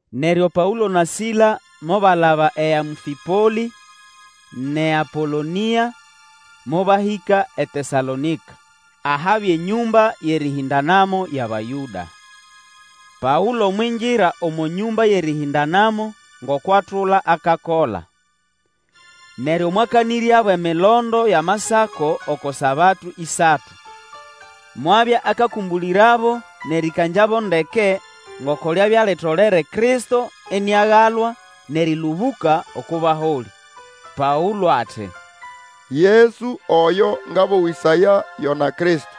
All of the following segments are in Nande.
Neryo Paũlo na Sila mobalaba eAmfĩpolĩ nʼeApolonĩa, mobahĩka eTesalonĩka ahabya enyũmba yʼerĩhĩndanamo yʼAbayũda. Paũlo mwingira omo nyũmba yʼerĩhĩndanamo ngoko atula akakola. Neryo mwakanĩryabo emilondo yʼAmasako oko Sabato ĩsatu. Mwabya akakũmbũlĩrabo nʼerĩkangyabo ndeke ngoko lyabya litolere Kristo iniagalwa, nʼerĩlũbũka oko baholĩ. Paũlo ati, Yesu oyo ngabowĩsaya, yona Kristo.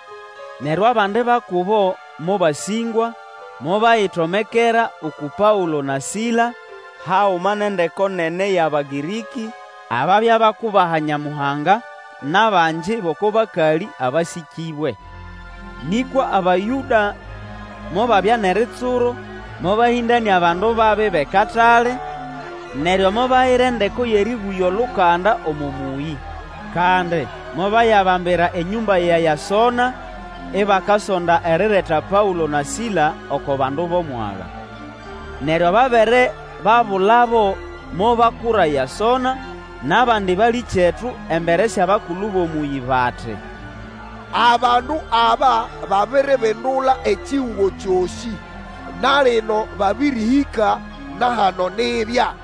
Neryo abandi ba kubo mobasĩngwa, mobayitomekera uku Paũlo na Sila, haguma nʼendeko nene yʼAbagĩrĩkĩ ababya bakubaha Nyamuhanga, nʼabangi bʼoko bakalĩ abasĩkĩbwe. Nĩkwa Abayũda mobabya nʼeritsuro mobahĩndanĩa bandu babi bʼekatale, neryo mobayira endeko yʼerĩbũgya olukanda omo mũyĩ. Kandi mobayabambira enyũmba ya Yasonĩ ibakasonda erireta Paũlo na Sila oko bandu bʼomwaga. Neryo babere babulabo, mobakura Yasona, nʼabandi balĩkyetu embere syʼabakulu bʼomũyĩ bati, Abandu aba babiribindula ekihugo kyosĩ! Na lino babĩrĩhĩka na hano nibya.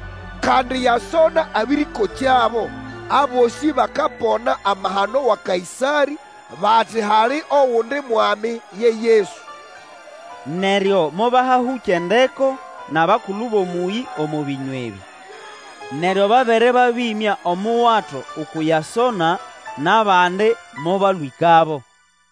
Kandi Yasona abĩrĩkokyabo. Abosĩ bakapona amahano wa Kaĩsarĩ, bati hali ogundi mwami ye Yesu. Neryo mobahahũkya endeko nʼabakulu bʼomũyĩ omo bĩnywa ebĩ. Neryo babere babĩmya omuwato uku Yasona nʼabandi mobalwĩkabo.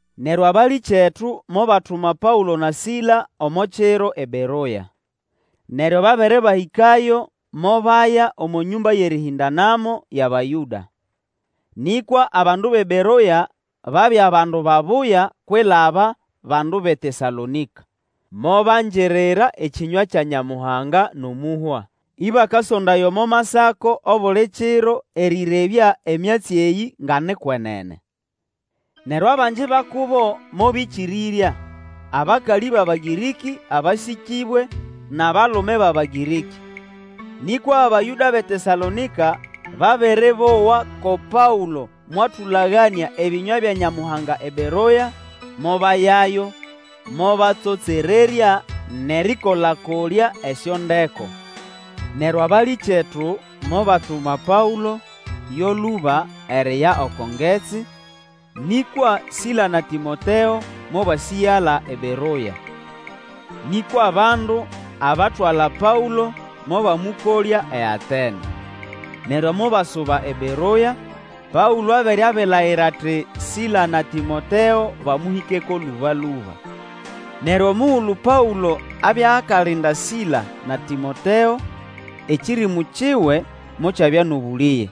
Neryo abalĩkyetu mobatuma Paũlo na Sila omo kiro eBeroya. Neryo babere babĩhĩkayo mobaya omo nyũmba yʼerĩhĩndanamo yʼAbayũda. Nĩkwa abandu bʼeBeroya babya bandu babuya kwilaba bandu bʼeTesalonĩka. Mobangirira ekĩnywa kya Nyamuhanga nʼomũhwa, ĩbakasondaya omo Masako obuli kiro erĩrebya emyatsi eyĩ nga ni kwenene. Neryo abangi ba kubo mobĩkĩrĩrya, abakalĩ bʼAbagĩrĩkĩ abasĩkĩbwe nʼabalume bʼAbagĩrĩkĩ. Nĩkwa Abayũda bʼeTesalonĩka babere bowa ko Paũlo mwatũlaganĩa ebĩnywa bya Nyamuhanga eBeroya, mobayayo, mobatsotsererya nʼerĩkola-kolya esyondeko. Neryo abalĩkyetu mobatuma Paũlo yo lũba eriya oko ngetsi, nĩkwa Sila na Tĩmoteo mobasĩgala eBeroya. Nĩkwa bandu abatwala Paũlo, mobamũkolya eAtene. Neryo mobasuba eBeroya; Paũlo abere abilayira ati Sila na Tĩmoteo bamũhĩkeko lũbalũba. Neryo omugulu Paũlo abya akalinda Sila na Tĩmoteo, ekĩrĩmũ kiwe mokyabya nʼobũlĩge,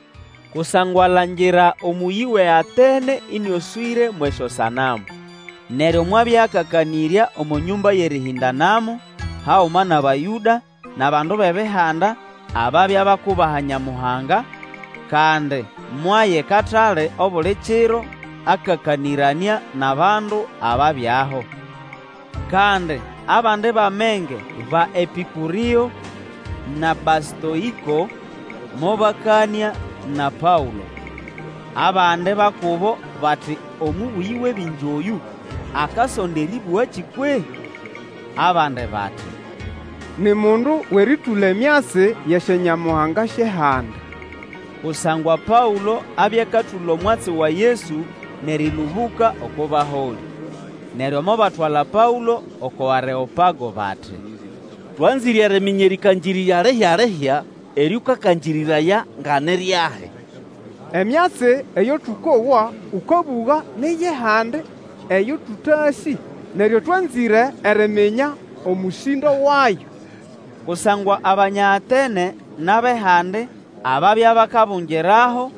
kusangwa alangira omũyĩ wʼeAtene ĩnĩoswĩre mwʼesyosanamu. Neryo mwabya akakanĩrya omo nyũmba yʼerĩhĩndanamo haguma nʼAbayũda nʼabandu bʼEbihanda ababya bakubaha Nyamuhanga, kandi mwaya ekatale obuli kiro akakanĩranĩa nʼabandu ababyaho. Kandi abandi bʼamenge ba Epĩkũrĩo na Bastoĩko mobakanĩa na Paũlo. Abandi ba kubo bati Omũbũyĩ wʼebingi oyũ, akasonda erĩbũgakĩ kwehĩ? Abandi bati, Ni mundu wʼerĩtũla emyatsi yʼesyonyamuhanga syʼehandi, kusangwa Paũlo abya akatũla omwatsi wa Yesu nʼerĩlũbũka oko baholĩ. Neryo mobatwala Paũlo oko Areopago bati, Twanzĩre eriminya erĩkangĩrĩrya lihya-lihya eryo ũkakangĩrĩraya nga ni ryahi. Emyatsi eyo tũkowa ũkabũga ni yʼehandi eyo tũtasĩ, neryo twanzĩre eriminya omũsĩndo wayo, Kusangwa Abanya Atene nʼabʼehandi ababya bakabungiraho,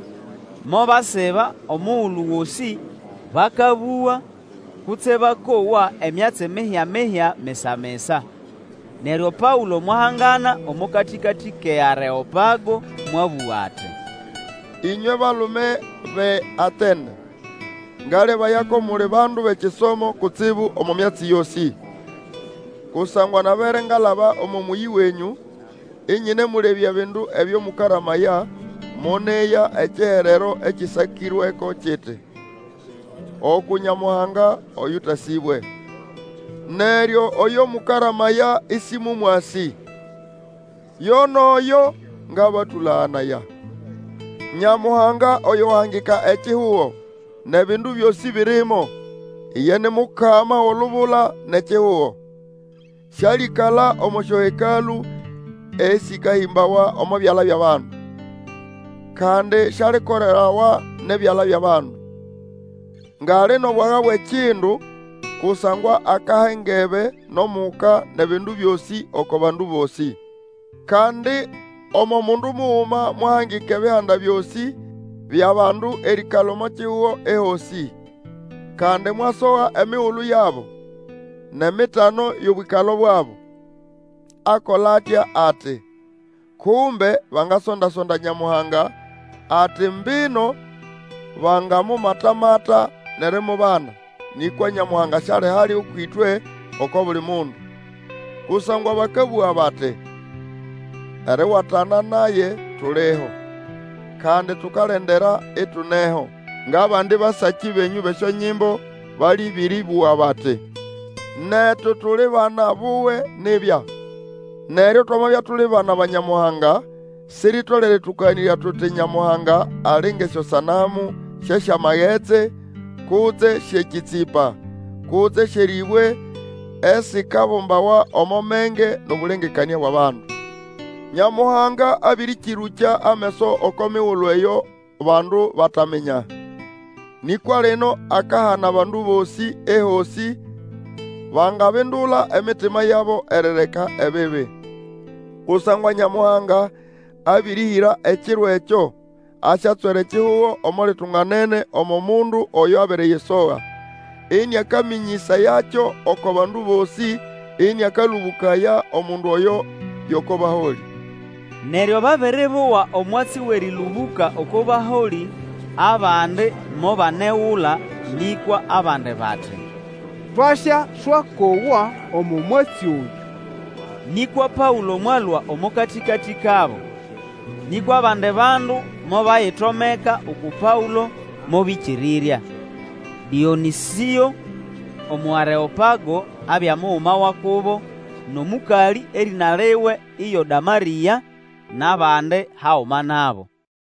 mobasiba omugulu gosĩ bakabũga kutse bakowa emyatsi mihya-mihya misa-misa. Neryo Paũlo mwahangana omo katĩkatĩ kʼeAreopago, mwabũga ati, Inywe balume bʼeAtene! Ngalebaya ko muli bandu bʼekisomo kutsibu omo myatsi yosĩ. Kusangwa nabere ngalaba omo mũyĩ wenyũ, inyinemũlebya ebindu ebyo mũkaramaya, moneya ekiherero ekĩsakĩrweko kiti, Uku Nyamuhanga oyũtasĩbwe. Neryo oyo mũkaramaya ĩsĩmũmwasĩ, yo nʼoyo ngabatũlaganaya. Nyamuhanga oyo wahangika ekihugo, nʼebindu byosĩ birimo, iye ni Mukama wʼolubula nʼekihugo, sĩalĩkala omo syohekalũ esĩkahĩmbawa omo byala byʼabandu. Kandi syalikolerawa nʼebyala byʼabandu, ngʼali nʼobwaga bwʼekindu, kusangwa akaha engebe nʼomuka nʼebindu byosĩ oko bandu bosĩ. Kandi omo mundu muguma mwahangika ebihanda byosĩ byʼabandu erĩĩkala omo kihugo ehosĩ. Kandi mwasoha emigulu yabo, nʼemitano yʼobwĩkalo bwabo. Akola atya ati, kumbe bangasonda-sonda Nyamuhanga, ati mbino bangamumata-mata nʼerimubana, nĩkwa Nyamuhanga syali hali ũkwʼĩtwe oko buli mundu. Kusangwa bakabũga bati: ‘Eriwatana naye tuliho, kandi tukalendera, ituneho.’ Ngʼabandi basakĩ benyũ bʼesyonyimbo balĩbĩrĩbũga bati, ‘Netu tuli bana buwe nibya.’ Neryo twamabya tuli bana ba Nyamuhanga, siritolere tũkaganĩrya tuti Nyamuhanga ali ngʼesyosanamu syʼesyamagetsi, kutse syʼekĩtsĩpa, kutse syʼerĩbwe esikabumbawa omo menge nʼobũlengekanĩa bwʼabandu. Nyamuhanga abĩrĩkĩrũkya ameso oko migulu eyo bandu bataminya, nĩkwa lino akahana bandu bosĩ, ehosĩ, bangabindula emitima yabo erireka ebibi. Kusangwa Nyamuhanga abĩrĩhĩra ekiro ekyo asyatswera ekihugo omo litunganene omo Mundu oyo abiriyisoga, ĩnĩakamĩnyĩsayakyo oko bandu bosĩ ĩnĩakalũbũkaya Omundu oyo yʼoko baholĩ! Neryo babere bowa omwatsi wʼerĩlũbũka oko baholĩ, abandi mobanegula, nĩkwa abandi bati, Twasyaswakowa omo mwatsi oyũ. Nĩkwa Paũlo mwalũa omo katĩkatĩ kabo. Nĩkwa abandi bandu mobayitomeka uku Paũlo mobĩkĩrĩrya. Dĩonĩsĩo Omũareopago abya muguma wa kubo, nʼomũkalĩ erĩna liwe iyo Damarĩa, nʼabandi haguma nabo.